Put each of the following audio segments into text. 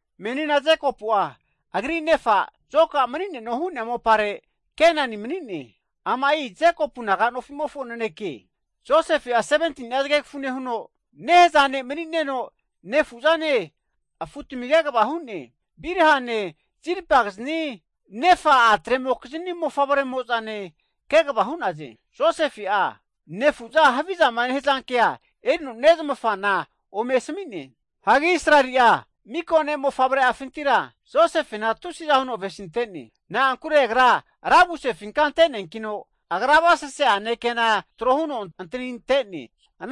Menina Jekopu'a agri nefa, mani'neno hu'nea mopare Kenani mopare mani'ne. Amai Jekopu naga nofimofo naneke. Josefe, 17tini'a zgegfu nehuno, nehaza ne' mani'neno nefu'zane afutmi kegvagrine, Bilhane, Zilpagizni nefa a'tremokizini mofavre'mozane kegva hu'naze. Josefe nefu'za haviza hza kea erino nezmafa ome asmi'ne. Menina Israeli'a (Jekopu'a) mika ne'mofavre afintira, Josefenku avesintene, na'ankure agra ravusefinka ante'ne, agra avasese'ane kena tro huno antanite'ne.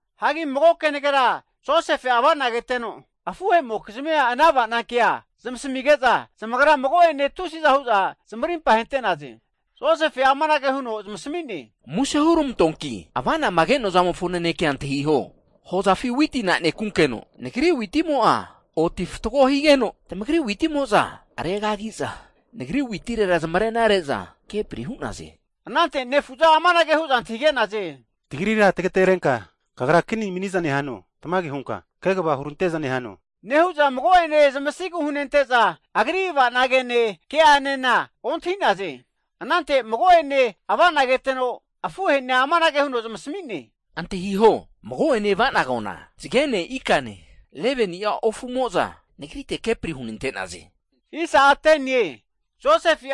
Anante Josefe'a avana keteno, afuhe'mokizmi ana avana ke nezmasmige'za, zamagra mago'ene tusiza huza zamarimpa hente'na'ze. Josefe amanage huno zamasmi'ne, Muse (plis) hurmantoanki ava'nama ke'noa kea antahiho, avanama ke'noana hozafi witi ananekunkeno nagri witimo'a oti fatgo higeno, tamagri witimo'za regagiza, nagri witire zamarena reza kepri hu'naze. Anante nefu'za amanage hu'za antahige'naze, Kagra, tagri tgaterenka rankva (kini) mani'za nehano. Tamage hunka kegva hurante'za nehano. Anage nehu'za mago'ene zamasigu hunente'za, agri avana gene, ke'anena ontahi'naze. Anante mago'ene ava'na keteno afuhei zamasmino amanage hu'ne, Antahiho, mago'ene ava'nagoana, zgene, ikane, 11ni'a ofumo'za nagrite kepri hunante'naze. Josefe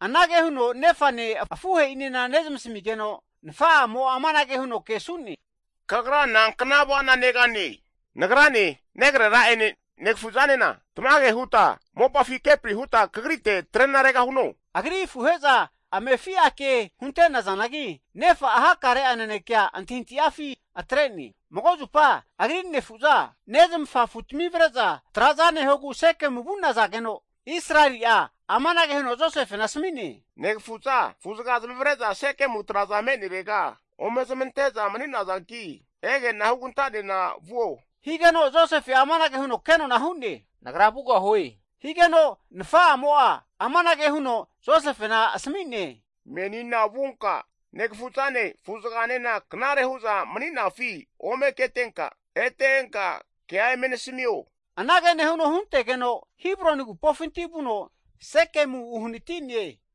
anage huno nefane, afuhei nezmasmigeno, nfa'amo kesuno amanage hu'ne, Kagra nankna avana negane? Nagrane, negrera'ene negfu'zanena tmage huta mopafi trena kagrite regahuno? Agri afuhe'za amefia ke hunte'nazanagi, nefa'a hakare'a nanekea antahi antahifi atre'ne. Mago'zupa agri nefu'za, nezmafa afutmi avre'za traza nehogu Sekemu vu'naze. Israeli'a, amanage huno Josefena asmi'ne, Negafu'za afuzga zamavre'za Sekemu traza me'nerega ome zamantenarega ege'na, huganta nenkenka zamagritega vuo. Josefe amanage huno kenona hu'ne, Nagra vugahue. Nefa amanage huno Josefe asmi'ne, Menina vunka negfuzane, afuzganena knare hu'za mani'nafi ome ketenka, ete enka kea eme nasmio. Anage nehuno huntegeno Hibroni agupofinti vuno Sekemu uhnatine.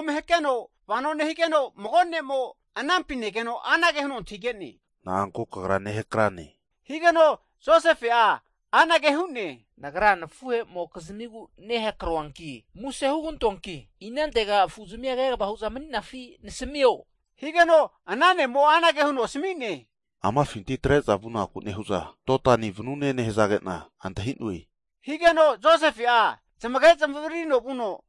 Hakeno vano nehigeno, mago ne'mo keteno azerino antahige'ne, Na'anku kagra nehakrane? Josefe anage hu'ne, Nagra nafuhemokizmigu nehakroe, muse (plis) hugantoanki inantega afu'zmi kegva huza mani'nafi nasmio. Anante ana ne'mo asmi'ne, Amafinti atre'za vunaku nehu'za, Dotani vanune nehzagena antahinoe, higeno Josefe'a zamage zamavririno vuno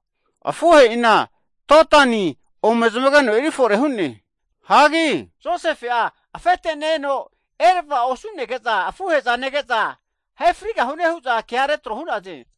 afuhe'ina Dontani ome zamage fore hu'ne. Josefe afete ne-eno eravao osunege'za nege'za, ahe frigahune hu'za ke retro hu'naze.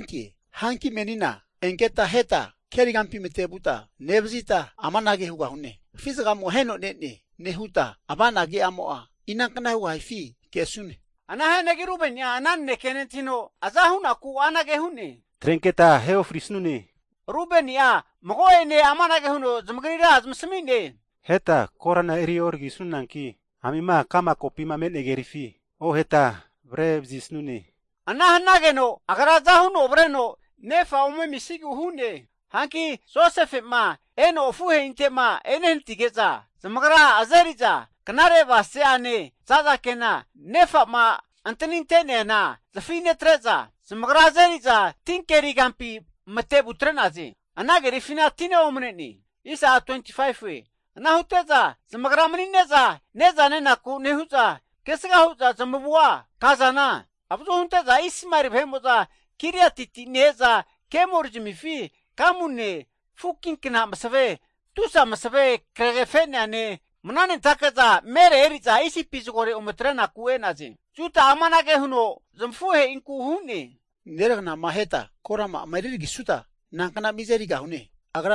Hanki menina, enketa aheta keri kampi mate'vuta nevzita, amanage hugahune. Afi zgamo aheno ne'ne, nehuta avana ke'amo nankna hugahifi kesune. Ana hianagi Rubeni'a ana naneke nentahino, zamazampinti aza hunaku anage hu'ne, atrenketa asimu'a e'orisune. Rubeni'a mago'ene amanage huno zamagri zamasmi'ne, Korana eri oragi'sune. Hanki amima ka'ma kopi me'nea kerifi oheta atre'sune, ana hnage'no agra aza huno avreno nefa ome amisigu hu'ne. Hanki Josefe'ma eno afuhe'inte'ma ehnatige'za, zamagra azeriza, knare avasese ane zaza kena nefama antaninte'nea zafi netre'za, zamagra azeriza ti keri kampi matevu atre'naze. Ana kerifina tina omnene. Ana hute'za, zamagra mani'neza ne'za nenaku nehu'za, kesga huza zamu kazana, avazu hunteza Ismaeli vahe'mo'za Giliatiti ne-eza, kemori'zmifi gamune, (fukinkna masve), tusa masve kregefe'neane (bam) mna'nentakeza mere'ne eri'za Isipi vunaku e'naze. Juda'a amanage huno nezmafunku hu'ne, Nankna miza erigahune nergnama aheta korama'a refitesuta?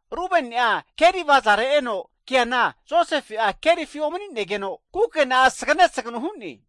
Rubeni'a keri avazare eno keana Josefe kerifi omni'negeno! kukena'a sgane sagnu hu'ne.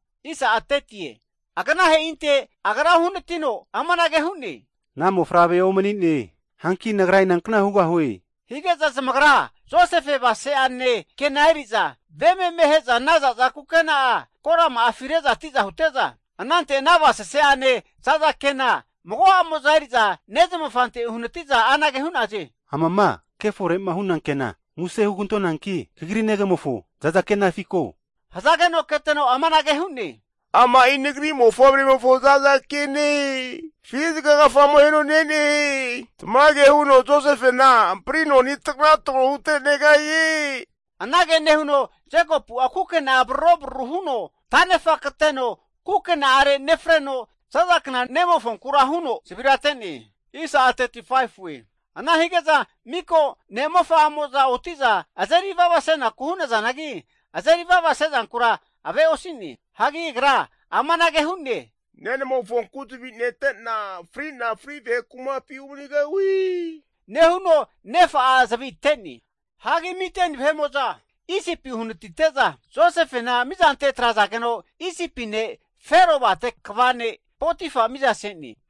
Aganaheinte agra uhnatino amanage hu'ne, Ana mofavre'a omni'ne, hanki nagra inantega vugahue? Hige'za zamagra Josefe avasese kena eri'za, ve meme ahe'za ana zaza kena'a korama'afi re'za tiza hute'za, anante ana avasese ma'ane zaza kena, mago'amo'za eri'za nezmafante uhnatiza anage hu'naze. Amama kefore'ma huna kena, muse (plis) hugantonanki kagri negamofo zaza kenafi ko. Anante keteno amanage hu'ne, amai nagri ne'mofavremofo zaza kene. Afi zgagfamo aheno ne'ne, tmage huno Josefena amprino anitraga trogo hutre'negahie! Anage nehuno Jekopu'a kukena'a braro bruru huno tanefa kateno kukena'are nefreno zaza kna ne'mofonkura zavira ate'ne. Ana hige'za mika ne'mofa amo'za, otiza azeri avavasenaku hu'nazanagi, azeri vava sezankura ave osine. Nehuno agra amanage hu'ne, Nenamofonku zvi netena frina fri vahe kumapi umanigahue. Nehuno nefa'a zvi ate'ne. Ana hige'za Midiani vahe'mo'za Josefena, mizante atrazageno, Isipi ne' Fero avate kva nemo Potifa miza se'ne.